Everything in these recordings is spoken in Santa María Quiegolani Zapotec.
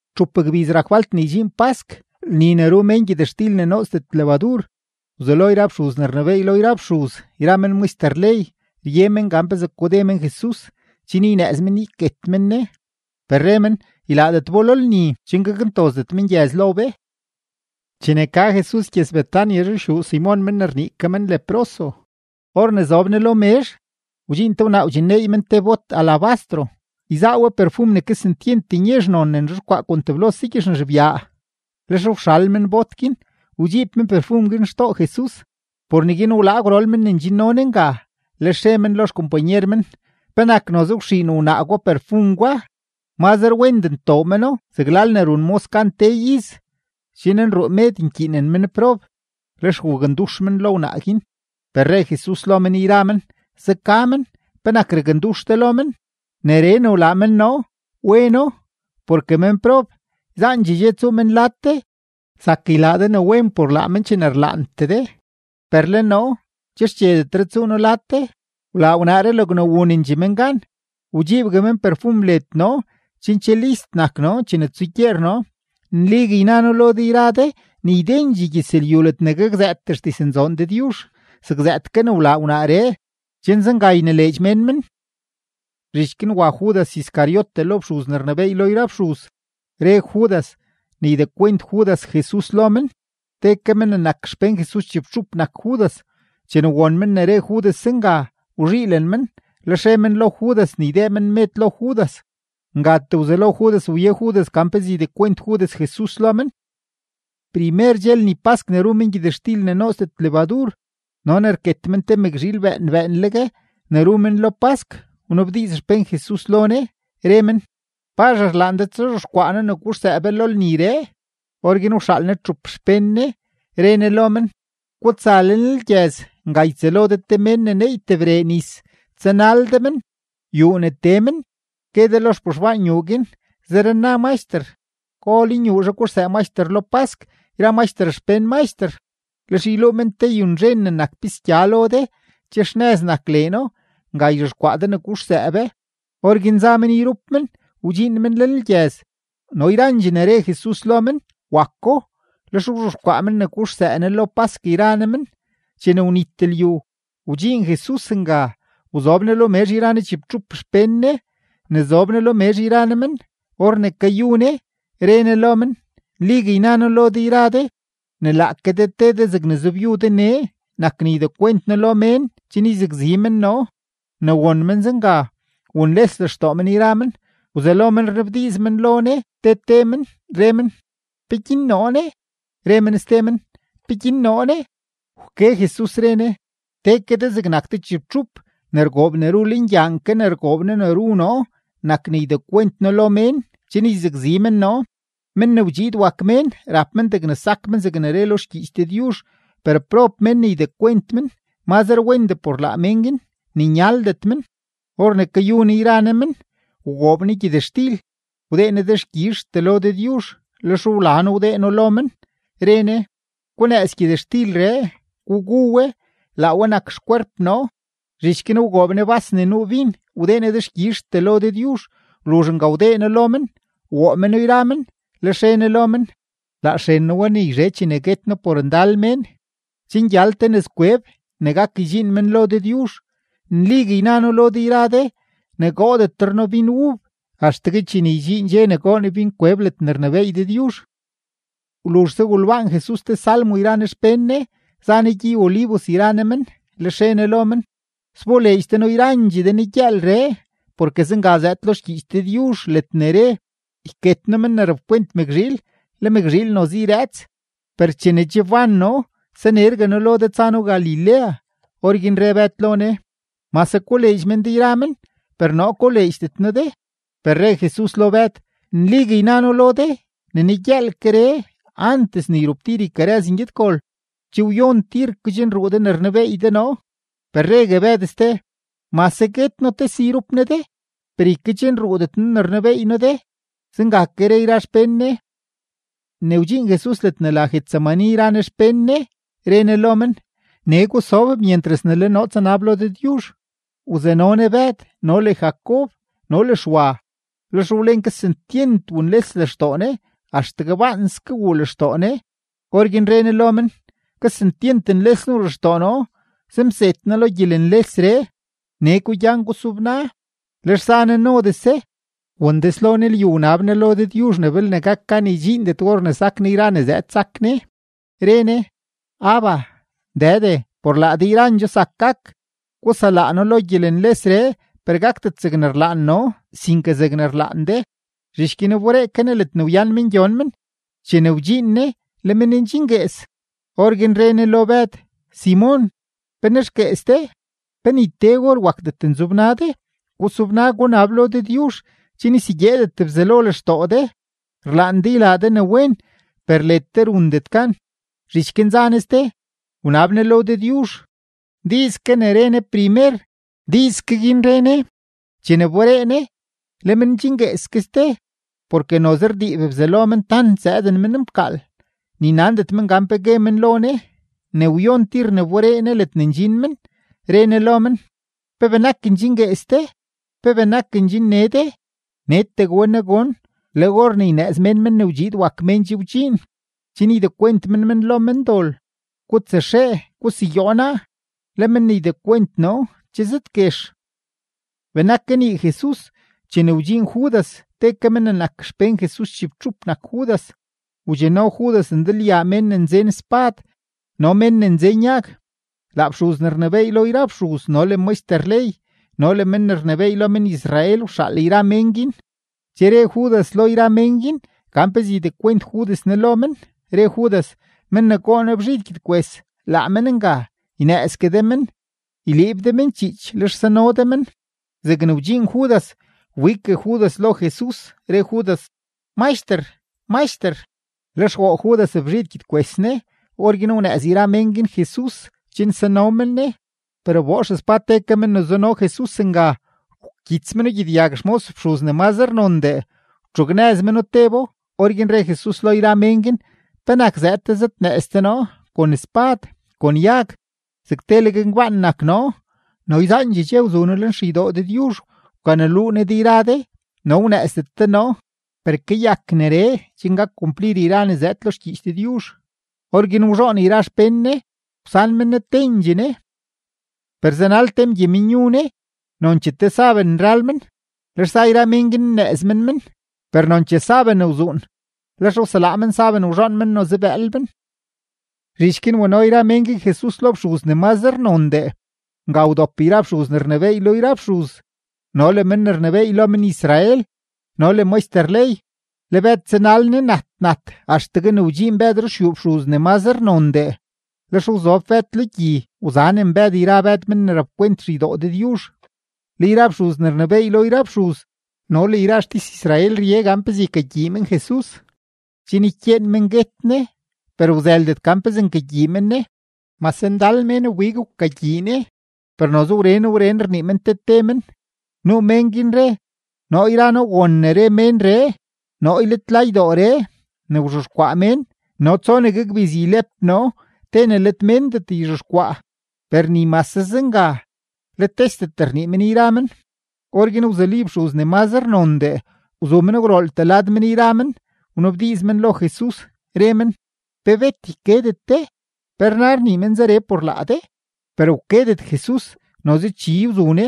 Txup gbiz rak falt ne ydxiin pask, lni ne ru mén gyëtxtil ne nootsdet lebadur, wzelo yra fxuz ne rnebééy lo yra fxuz yra men maxter ley rye men gan pezee kode men Jesus chen ynëëz men Ne yket men Ne. Per re men: ―Ylaadet bo lo lni chen gakntozdet mengyëz lo be. Chene ka Jesus gyëz-Betania ruxyuu Simon men ne rnii ke men Leproso, or ne zob Ne lo mezh, wdxiin te wnaa wdxinneey men te bot alabastro, yzaa we perfum ne kesentyent nyezh non ne nzhexkwaa kon teblose gyexnazh byaa. Lex wxal men bot guin, wdxiib men perfum guin xtoo Jesus. Por neguin wlaa gwrol men ne ndxinno Ne nga, lex re men lo xkompanyer men: ―¿Penak noze wxiin wnaa gwa perfum gwa? Mazre wendee ntoo meno zeg lal ne run mos gan te iz, chen nruu med nkyiinen menprob. Lex wakndux men lo wnaa guin. Per re Jesus lo men yra men: ―Zeka men. ¿Penak rakndux de lo men? Neree ne wlaa men noo, weno. Porke menprob yzaandxee dxe tsuu men lad de, zak ylaa de ne wen por laa men chene rlaantee de, per le noo che xchedetre tsuu noo lad de. Wlaa wnaaree logne wunendxee men gan; wdxiibgue men perfum led noo chen che list nak noo chene tsugyeer noo. Nligue yna noo lo de yra de ne ydendxee gyëzlyu ledne gakzëëttee xdiznzoon Dëdyuzh, zakzëët ke ne wlaa wnaaree, chen zenga ynileedx mén men. Zhich guin wa Judas Iscariote lo fxuz ne rnebééy lo yra fxuz, re Judas ne ydekwent Judas Jesus lo men. Te ke men ne nak xpén Jesus chibtxup nak Judas. Chene won men ne re Judas zenga, wzhiilen men, lex re men lo Judas ne ydee men med lo Judas. Ngatee wzelo Judas wye Judas gan pezee ydekwent Judas Jesus lo men. Primer dxe lni pask ne ru mén gyëtxtil ne nootsdet lebadur no ne rket men te mëkzhiil bëën bëënleg ne ru men lo pask, wnabdiiz xpén Jesus lo Ne, re men: ―¿Pazh rlaan de tsazhexkwaa noo ne guxsëë be lo lniree? Orguin wxaal Ne txup xpén Ne, re Ne lo men: ―Gutsa lenlgyëz. Nga ytsëlo de te mén ne neey tebree nis. Tsanal de men. Yuu ne tee men, gue de lo xpexwaan yuu guin: “Zere na Maxter, ¿go lenyuuzhe guxsëë Maxter lo pask yra Maxter xpén Maxter?” Lex yluu men te lenyunzhen ne nak pisgya lo de, che xnëz nak leeno; nga yzhexkwaa de ne guxsëë be. Orguin za men yrup men, wdxiin men lenlgyëz, no yrandxee ne re Jesus lo men, wako. Lex wzhexkwaa men ne guxsëë Ne lo pask yra Ne men. Chene wnit lyu, wdxiin Jesus nga, wzob Ne lo mezh yra Ne chibtxup xpén Ne. Ne zob Ne lo mezh yra Ne men, or ne kayu Ne, re Ne lo men: ―Nligue yna noo lo de yra de, ne laake de te de zegne zobyu de nee nak ne ydekwent noo lo mén chen yzakzi men noo. Ne won men zenga, wunles lextoo men yra men, wzelo men rnabdiiz men lo Ne te te men, re men: ―¿Peguin noo ne? Re men ste men: ―¿Peguin noo ne? Wke Jesus, re Ne: ―Te ke de zegnak de chibtxup ne rgoob ne ru lengyaan ke ne rgoob noo ne ru noo nak ne ydekwent noo lo mén chen yzakzi men noo. Men ne wdxiid wak Mén rap men degne sak men zegne re lo xgyiich Dëdyuzh; per ¡prob mén ne ydekwent men! Mazre wendee por laa mén guin ne nyaldet men. Or ne kayu Ne yra Ne men, wgoob Ne gyëtxtil, wdee Ne dexkyizhtee lo Dëdyuzh, lex wla No wdee No lo men, re Ne: ―Gunëëz gyëtxtilree, gugu we; laa we nak xkwerp noo. Zhich guin wgoob Ne bas ne nuu bin, wdee Ne dexkyizhtee lo Dëdyuzh; wluzh nga wdee No lo men, woo meno yra men. Lex re Ne lo men: ―Laa xren noo wa ne yzhe chene guet noo por ndal mén, chen gyal te nëzkweb ne gak ydxiin men lo Dëdyuzh. Nligue yna noo lo de yra de ne goodetre noo bin ub, axtegue chene ydxiin dxe ne goo noo binkweb ledne rnebééy Dëdyuzh. Wluzhse wolbaan Jesus te salmo yra Ne xpén Ne, za Ne gyey-Olivos yra Ne men. Lex re Ne lo men: ―Sboleedx de noo yrandxee de negyëëlree, porke zenga zëëd lo xgyiich Dëdyuzh ledne re: “Yket noo men ne rapkwent mëkzhiil, le mëkzhiil noze yrëëts.” Per chene che wban noo, sanergue noo lo de tsa noo Galilea. Orguin re Bëd lo Ne: ―Mase koleedx men de yra men, per noo koleedxdet noo de. Per re Jesus lo Bëd: ―Nligue yna noo lo de ne negyëëlkeree, antes ne yrup tir ykarëz ngyedgol, che wyon tir wkedxnruu de ne rnebeey de noo. Per regue Bëd ste: ―Mase guet noo tese yrup noo de, per ykedxnruudet noo ne rnebeey noo de. Zenga ke re yra xpén Ne. Ne wdxiin Jesus ledne la Getsemaní yra Ne xpén Ne, re Ne lo men: ―Nee gusob myentras ne le noo tsanab lo Dëdyuzh. Wzano Ne Bëd, no le Jacob, no le Xwa; lex wlen kesentyent wunles lextoo Ne, axtegue baanske wuu lextoo Ne. Orguin re Ne lo men: ―Kesentyent nles nuu lextoo noo, zem zet noo lo gyelenlesree. Nee gugyan, gusobna. Lex za Ne nodese, wandeslo Ne lyu wnab Ne lo Dëdyuzh ne belne gak gan, ydxiindet or ne sak Ne yra ne zëëd sak Ne, re Ne: ―Abba, Dëde, por laa de yrandxoo zak gak. Guselaa noo lo gyelenlesree; per gakdet zegne rlaan noo, sinke zegne rlaan de. Zhich guin wberee ke Ne ledne wyan men gyon men; chene wdxiin Ne, le men ndxinguees. Orguin re Ne lo Bëd: ―Simon, ¿pe nexguees de? ¿Pe ni te or wakdet nzobna de? Gusobna, gunab lo Dëdyuzh chen ysegyeedet Bzelo lextoo de. Rlaan de ylaa de ne wen, per led de rundet gan. Zhich guin za Ne ste, wnab Ne lo Dëdyuzh. Diiz ke ne re Ne primer, diiz ke guin re Ne. Chene wberee Ne, le men ndxinguees ke ste, porke noze rdiib bzalo men tant zëëden men mkaal, ni nandet men gan pe gue men lo Ne. Ne wyon tir ne wberee Ne ledne ndxin men, re Ne lo men: ―¿Pe benak ndxinguees de? ¿Pe benak ndxinne de? Neetegue we nagon; le or ne ynëëz mén Men ne wdxiid wak Mén che wdxiin, chen ydekwent mén men lo mendol. Gutsaxee, guseyoo naa; le men ne ydekwent noo che zëdguex. Benak kanii Jesus chene wdxiin Judas; te ke men ne nak xpén Jesus chibtxup nak Judas; wdxinno Judas ndalyaa mén ne nzen spad no le mén ne nzen yag. Laa fxuz ne rnebééy lo yra fxuz no le maxter ley no le men ne rnebééy lo men-Israel wxaal yra mén guin. Che re Judas lo yra mén guin gan pezee ydekwent Judas Ne lo men, re Judas: ―Men ne goo noo bzhid gyedkwes, laa men nga; ynëëzgue de men, yliib de men chiich, lex sano de men. Zegne wdxiin Judas, wbiggue Judas lo Jesus, re Judas: ―Maxter, Maxter. Lex woo Judas bzhid gyedkwes Ne. Orguin wnëëz yra mén guin Jesus chen sano men Ne. Per wboo xespad te ke men ne zuno Jesus nga, wkyits meno gyedyag xmos fxuz ne mazre nondee, wtxugnëz meno tebo. Orguin re Jesus lo yra mén guin: ―¿Penak zëëd de zëdnëëz de noo kon spad, kon yag, zeg teleg ngbaan nak noo? No yzaandxee dxe wzu noo lenxeydoo Dëdyuzh wkaneluu noo de yra de, no wnëëzdet de noo. Per kayak neree chen gak kumplir yra ne zëëd lo xgyiich Dëdyuzh. Orguin wzhoon yra xpén Ne, wsan men Ne tendxee Ne. Per zanal te mgyeymenyu Jesus, nonchee te saben nrël men. Lex za yra mén guin nnëëz men men, per nonchee saben wzuun. Lex wseláá men saben, wzhoon men noze bëël men. Zhich guin wano yra mén guin Jesus lo fxuz ne mazre nondee. Nga wdop yra fxuz ne rnebééy lo yra fxuz, no le men ne rnebééy lo men-Israel, no le maxter ley. Le Bëd zanal Ne nat nat axtegue ne wdxiin Bëd ruxyuu fxuz ne mazre nondee. Lex wzob Bëd lo gyi wzanen Bëd yra Bëd men ne rapkwent xeydoo Dëdyuzh. Le yra fxuz ne rnebééy lo yra fxuz no le yra xtis-Israel rye gan pezee ykagyii men Jesus, chen ykyeen men guet Ne. Per wzëldet gan pezee nkagyii men Ne. Mase ndal mén wbig wkagyii Ne, per noze wren wren rnii men te te men. Nuu mén guin re: ―Noo yra noo won ne re ménree: “Noo ylitla ydooree ne wzhexkwaa mén no tsonegue gbiz ylep noo te ne let méndet yzhexkwaa.” Per ni mase zenga, let tesdet rnii men yra men. Orguin wzuli fxuz ne mazre nondee, wzu men gwrooltee lad men yra men, wnabdiiz men lo Jesus, re men: ―¿Pe bet ykedet de? ¿Pe rna rnii men zeree por laa de? Per wkedet Jesus, noze chi wzu Ne.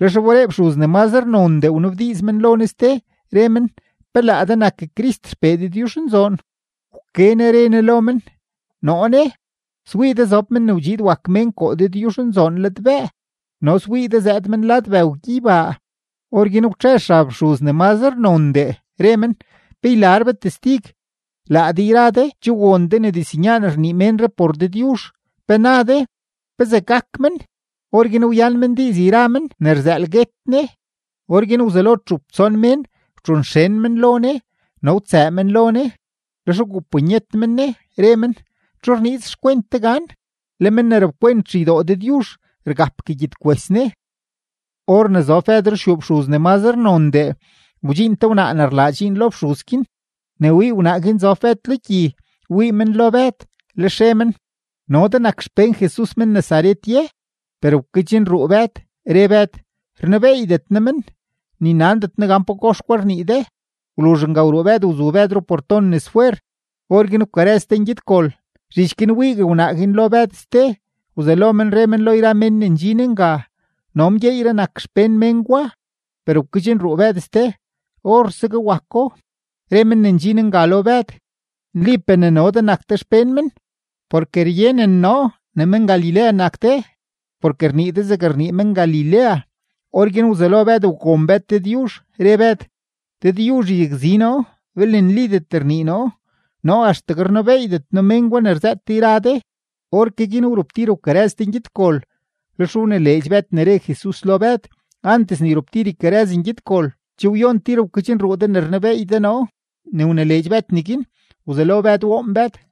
Lex wberee fxuz ne mazre nondee wnabdiiz men lo Ne ste, re men: ―¿Pe laa de nak Crist XPee Dëdyuzhnzoon? Wke Ne re Ne lo men: ―Noo ne. Swii de zob Men ne wdxiid wak Mén koo Dëdyuzhnzoon ladbëë no swii de zëëd men lad bëw gyeybaa. Orguin wtxëz xab fxuz ne mazre nondee, re men: ―Pe ylar be testig. Laa de yra de che won de ne diznyaan rnii ménree por Dëdyuzh. ¿Pe na de, pezee gak men? Orguin wyan men diiz yra men ne rzëël guet Ne. Orguin wzelo txup tson mén wtxonxen men lo Ne no wtsëë men lo Ne, lex wgupunyet men Ne, re men: ―¿Txu rniiz xkwent de gan? Le men ne rapkwent xeydoo Dëdyuzh rgapgue gyedkwes Ne. Or ne zob Bëd ruxyuu fxuz ne mazre nondee, wdxiin te wnaa ne rlaa dxiin lo fxuz guin. Ne wii wnaa guin zob Bëd lo gyi, wii men lo Bëd, lex re men: ―¿No de nak xpén Jesus men-Nazaret ye? Per wkedxnruu Bëd, re Bëd: ―Rnebeeydet noo men, ni nandet noo gan pagox gwa rnii de. Wluzh nga wruu Bëd wzu Bëd ruporton nes fwer. Orguin wkarëz te ngyedgol. Zhich guin wiigue wnaa guin lo Bëd ste, wzelo men re men lo yra mén ne ndxin nga: ―No mgyeeyree nak xpén mén gwa. Per wkedxnruu Bëd ste. Orsegue wako, re men ne ndxin nga lo Bëd: ―Nlipee ne no de nak te xpén men, porke ryenen noo ne men-Galilea nak de porke rnii de zegne rnii men-Galilea. Orguin wzelo Bëd wgon Bëd Dëdyuzh, re Bëd: ―Dëdyuzh yzakzi noo belne nlidet rnii noo. ¡Noo axtegue rnebeeydet noo mén gwa ne rzëët de yra de! Orke guin wrup tir wkarëz te ngyedgol. Lex wnileedx Bëd ne re Jesus lo Bëd: “Antes ne yrup tir ykarëz ngyedgol, che wyon tir wkedxnruu de ne rnebeey de noo.” Ne wnileedx Bëd neguin, wzelo Bëd woon Bëd.